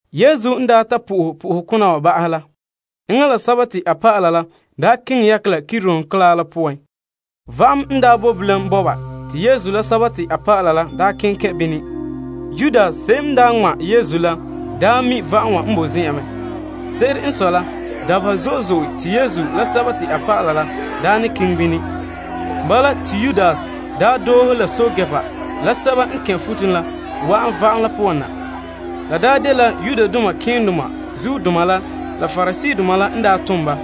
Yesu n daa ta po'ohɛ po'ohokona wa ba'ahɛ la, enŋa la a dɔlɔba la keŋɛ yakɛ la Kidron bɔn'ɔn la poan. Va'am me n boe bilam bɔba te Yesu la a dɔlɔba la daa keŋɛ kɛn' bini. Yudas se'em n daa ŋma' Yesu la mi' va'am wa n boe zen'an mɛ. Se'ere n sɔe la, dabeha zo'e zo'e te Yesu la a dɔlɔba la ne keŋɛ bini. Bala, te Yudas doohe la pɛɛntɛɛnreba la guruba la wa'an va'am la poan na. La daa dela malema keendoma la, la Pariseedoma la n tom ba.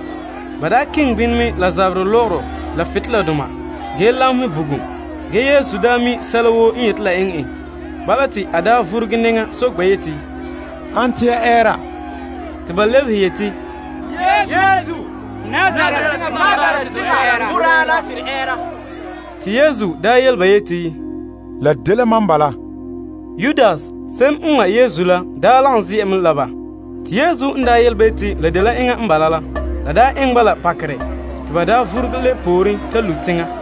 Ba keŋɛ bini mɛ la zaberɛ lɔgɔrɔ la butoleladoma, ge lamehɛ bugum. Ge Yesu mi' sɛla woo n yeti la eŋɛ en. Bala, te a vuruge nɛŋa soke ba yeti, Ane te ya ɛɛra? Te ba lebehe yeti, Yesu, Nazaret teŋa boraa la te to ɛɛra. Te Yesu daa yele ba yeti, La dela mam bala. Yudas, se'em n ŋma' Yesu la daa lagom ze'a mɛ la ba. Te Yesu n yele ba yeti la dela enŋa n bala la, la eŋɛ ba la pakerɛ, te ba vuruge lebe pooren lu' teŋa.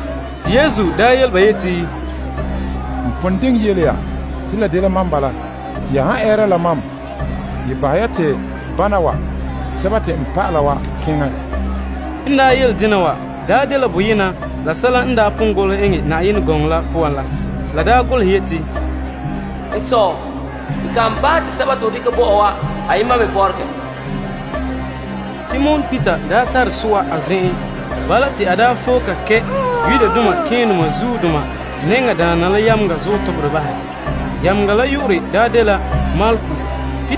Te Yesu yele ba yeti, N pon diŋɛ yele ya te la dela mam bala. Te ya han ɛɛra la mam, bahɛ ya te bana wa, n dɔlɔba wa keŋɛ. N yele dena wa dela boyena la sɛla te a pon yeti, N Sɔ, n kan bahɛ te sɛba te ho dekɛ bo mam wa ayema me bɔregɛ. Simon Peter daa tare so'a a zen'en. Bala, te a foe ka kɛ' malema nɛŋadaana la yameŋa zuɔ toberɛ bahɛ. Yameŋa la yu'urɛ dela Malkus.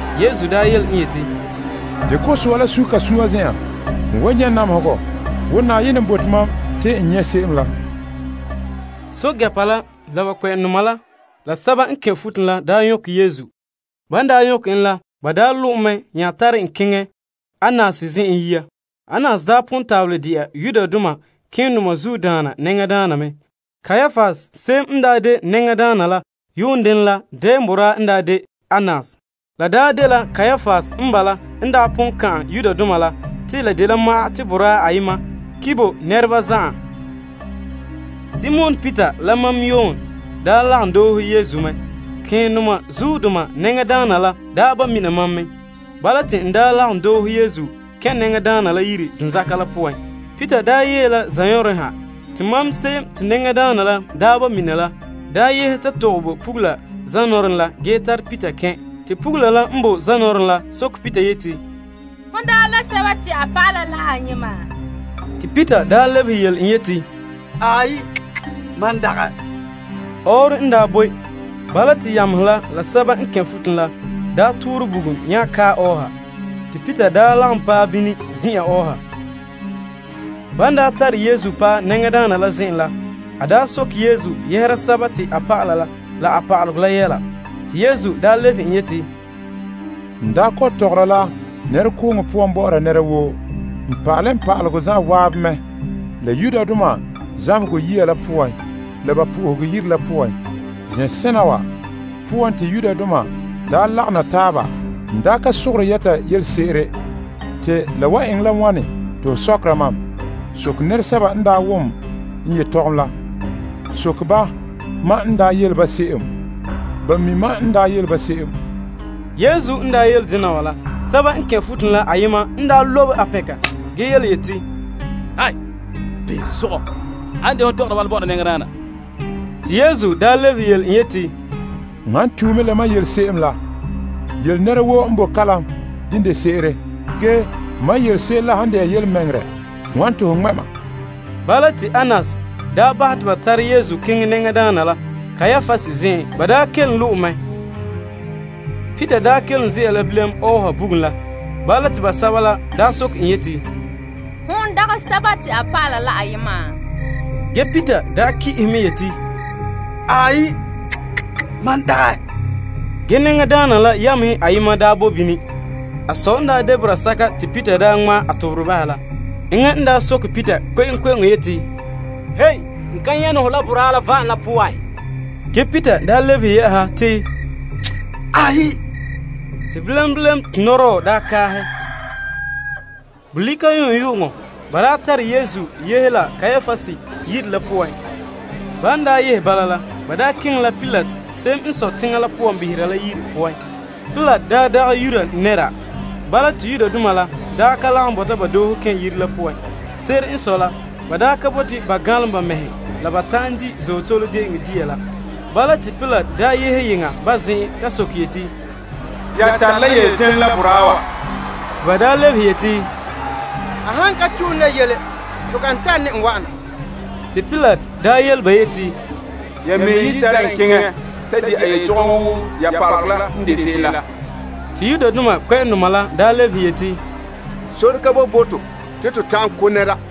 Yesu yele en yeti, Dekɛ ho so'a la sun' ka sun'an zen'an. N wan nyɛ' namehegɔ wo Na'ayenɛ n bote mam te n nyɛ' se'em la. Pɛɛntɛɛnreba la, la ba kpɛ'ɛma la, la guruba la nya nyɔkɛ Yesu. Ban daa nyɔkɛ en la, ba lo' en mɛ, nya tare en keŋɛ Annas zen'en yia. Annas daa pon tabelɛ de'a malema nɛŋadaana mɛ. Kaiapas, se'em n daa de nɛŋadaana la yuun denɛ la, dɛɛn boraa n daa de Annas. La daa dela Kaiapas n bala n daa pon ka'an Yudoma la te la de ma'an te boraa ayema ki' bo nɛreba zan'an. Simon Peter la mam Yon nya lagom doohe Yesu mɛ. Malema nɛŋadaana la daa ba' mina mam mɛ. Bala, te n lagom doohe Yesu kɛn' nɛŋadaana la yire zenzaka la poan. Peter yee la yeŋa zanɔɔren ha. Te mam se'em te malema nɛŋadaana la ba' mina la daa yehe ta tɔgɛ bo pugula zanɔɔren la ge tare Peter kɛn'. Te pugula la n bo zanɔɔren la soke Peter yeti, Hon dagɛ la a dɔlɔba la ayema? Te Peter lebehe yele en yeti, Aai, mam dagɛ. Ɔɔrɔ n boe. Bala te yamehe la guruba toorɛ bugum nya kae ɔɔha. Te Peter lagom paɛ bini ze'a ɔɔha. Ban tare Yesu paɛ malema nɛŋadaana la zen'en la, a daa soke Yesu yɛhera a dɔlɔba la a pa'alegɔ la yɛla. Te Yesu lebehe en yeti, N kɔ'ɔn tɔgɔra la nɛrekooŋɔ poan bɔ'ɔra nɛra woo. N pa'ale n pa'alegɔ zan'an mɛ la Yudoma zamehegɔ yiya la poan la ba Yenɛ Yire la poan. Zen'sena wa poan te Yudoma daa ne lagom na taaba. N ka sogore yɛta yelese'ere. Te la wan eŋɛ la wane te ho sɔkera mam? Soke nɛresɛba n wom n yetɔgɔm la. Soke ba mam n yele ba se'em. Ba mi' mam n yele se'em. Yesu n yele dena wa la, guruba la ayema n boe bini la lobe a pɛnka ge yeti, Ane n de hon tɔgɔra bala bɔ'ɔra malema nɛŋadaana? Te Yesu lebehe yele en yeti, N han tue mɛ la mam n yele se'em la, yele nɛra woo n boe kalam dene de se'ere. Ge, mam yele se'em la han de'a yelemɛŋɛrɛ, wane te ho ŋmɛ' mam? Bala, te Annas bahɛ te ba tare Yesu keŋɛ malema nɛŋadaana la Kaiapas zen'en. Ba kelom lo' en mɛ. Peter daa kelom ze'a la bilam ɔɔha bugum la. Bala, te basɛba la soke en yeti, Hon dagɛ a dɔlɔba la ayema? Ge, Peter ki'ehe mɛ yeti, Aai, mam dagɛ. Ge malema nɛŋadaana la yamehe la ayema daa bo bini. A sɔɔn n de boraa sɛka te Peter daa ŋmaa a toberɛ bahɛ la. Enŋa n soke Peter kpe'eŋkpe'eŋo yeti, N ka nyɛ' ne hɔ la boraa la va'am la poan? Ge Peter lebehe yɛ'ɛha te, Aai. Te bilam bilam, te nɔdɔɔ daa kaahɛ. Bolika yu'uŋyu'uŋɔ, ba nya yehe Yesu Kaiapas yire, keŋɛ la Pilate, se'em n sɔe teŋa la poan behera la yire. Pilate dagɛ Yuda nɛra. Bala, te Yudoma la ka lagom doohe kɛn' yire la poan. Se'ere n sɔe la, ba ka bote ba ganlom ba mɛhe la ba ta'an di' Azootole De'eŋɔ dia la. Bala, te Pilate yehe yeŋa ba zen'an ta soke yeti, Ya tare la yele denɛ la boraa wa? Te ba lebehe yeti, A han ka tue ne la yele, to kan tare ne en wa'an na. Te Pilate yele ba yeti, Ya mɛhe ye tare en keŋɛ ta di' a yetɔgɔm wo ya pa'alegɔ la n de se'em la. Te Yudoma la lebehe yeti, Sore ka boe bo to te to ta'an ko' nɛra.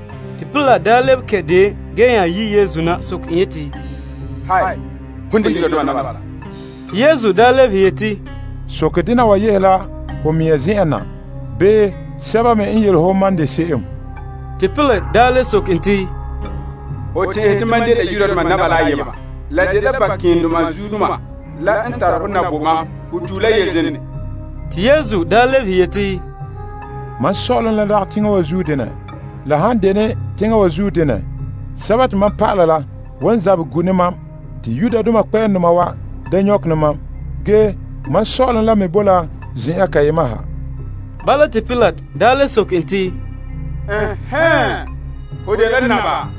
Te Pilate nya lebe kɛn' deon ge daa yi' Yesu na soke en yeti, Hon de Yudoma naba La? Te Yesu lebehe yeti, Soke dena wa yehe la ho mea zen'en na, bii sɛba me n yele ho mam n de se'em? Te Pilate le soke en te, Ho tɛn'ɛhe te mam dela Yudoma la ayema? La dela ya malema keendaana la n tare hɔ na bo mam. Ho tue la yele dene? Te Yesu lebehe yeti, Mam sɔ'ɔlom la dagɛ teŋa wa zuo denɛ. La han dene teŋa wa zuo denɛ, sɛba te mam pa'ala la wan zabɛ gu' ne mam te Yudoma wa da nyɔkɛ ne mam. Ge, mam sɔ'ɔlom la me bo la zen'an kayema ha. Bala, te Pilate le soke en te, Ɛnhɛɛn, ho ye dela naba?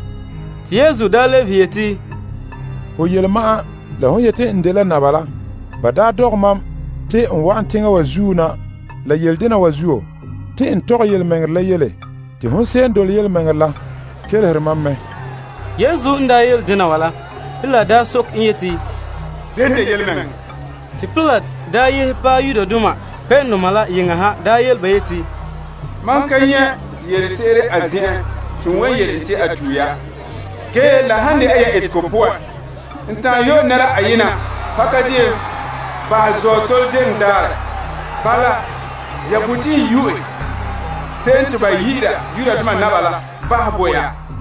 Te Yesu daa lebehe yeti, Ho yele ma'an, la hon yeti n dela naba la. Ba dɔgɛ mam te n wa'an teŋa wa zuo na la yele dena wa zuo. Te n tɔgɛ yelemɛŋɛrɛ la yele. Te hon se'em n dole yelemɛŋɛrɛ la kelehere mam mɛ. Yesu n yele dena wa la, Pilate daa soke en yeti, Bene n de yelemɛŋɛrɛ? Te Pilate yehe paɛ Yudoma la yeŋa ha yele ba yeti, Mam ka nyɛ' yelese'ere a zen'en te n wan yele en te a tue ya. Ge, la han de'a ya etegɔ poan, n ta'an yo'ɛ nɛra ayena pakadeen bahɛ Azootole De'eŋɔ daarɛ. Bala, ya bote n yo'ɛ se'em te ba yi'ira Yudoma naba la bahɛ bo ya?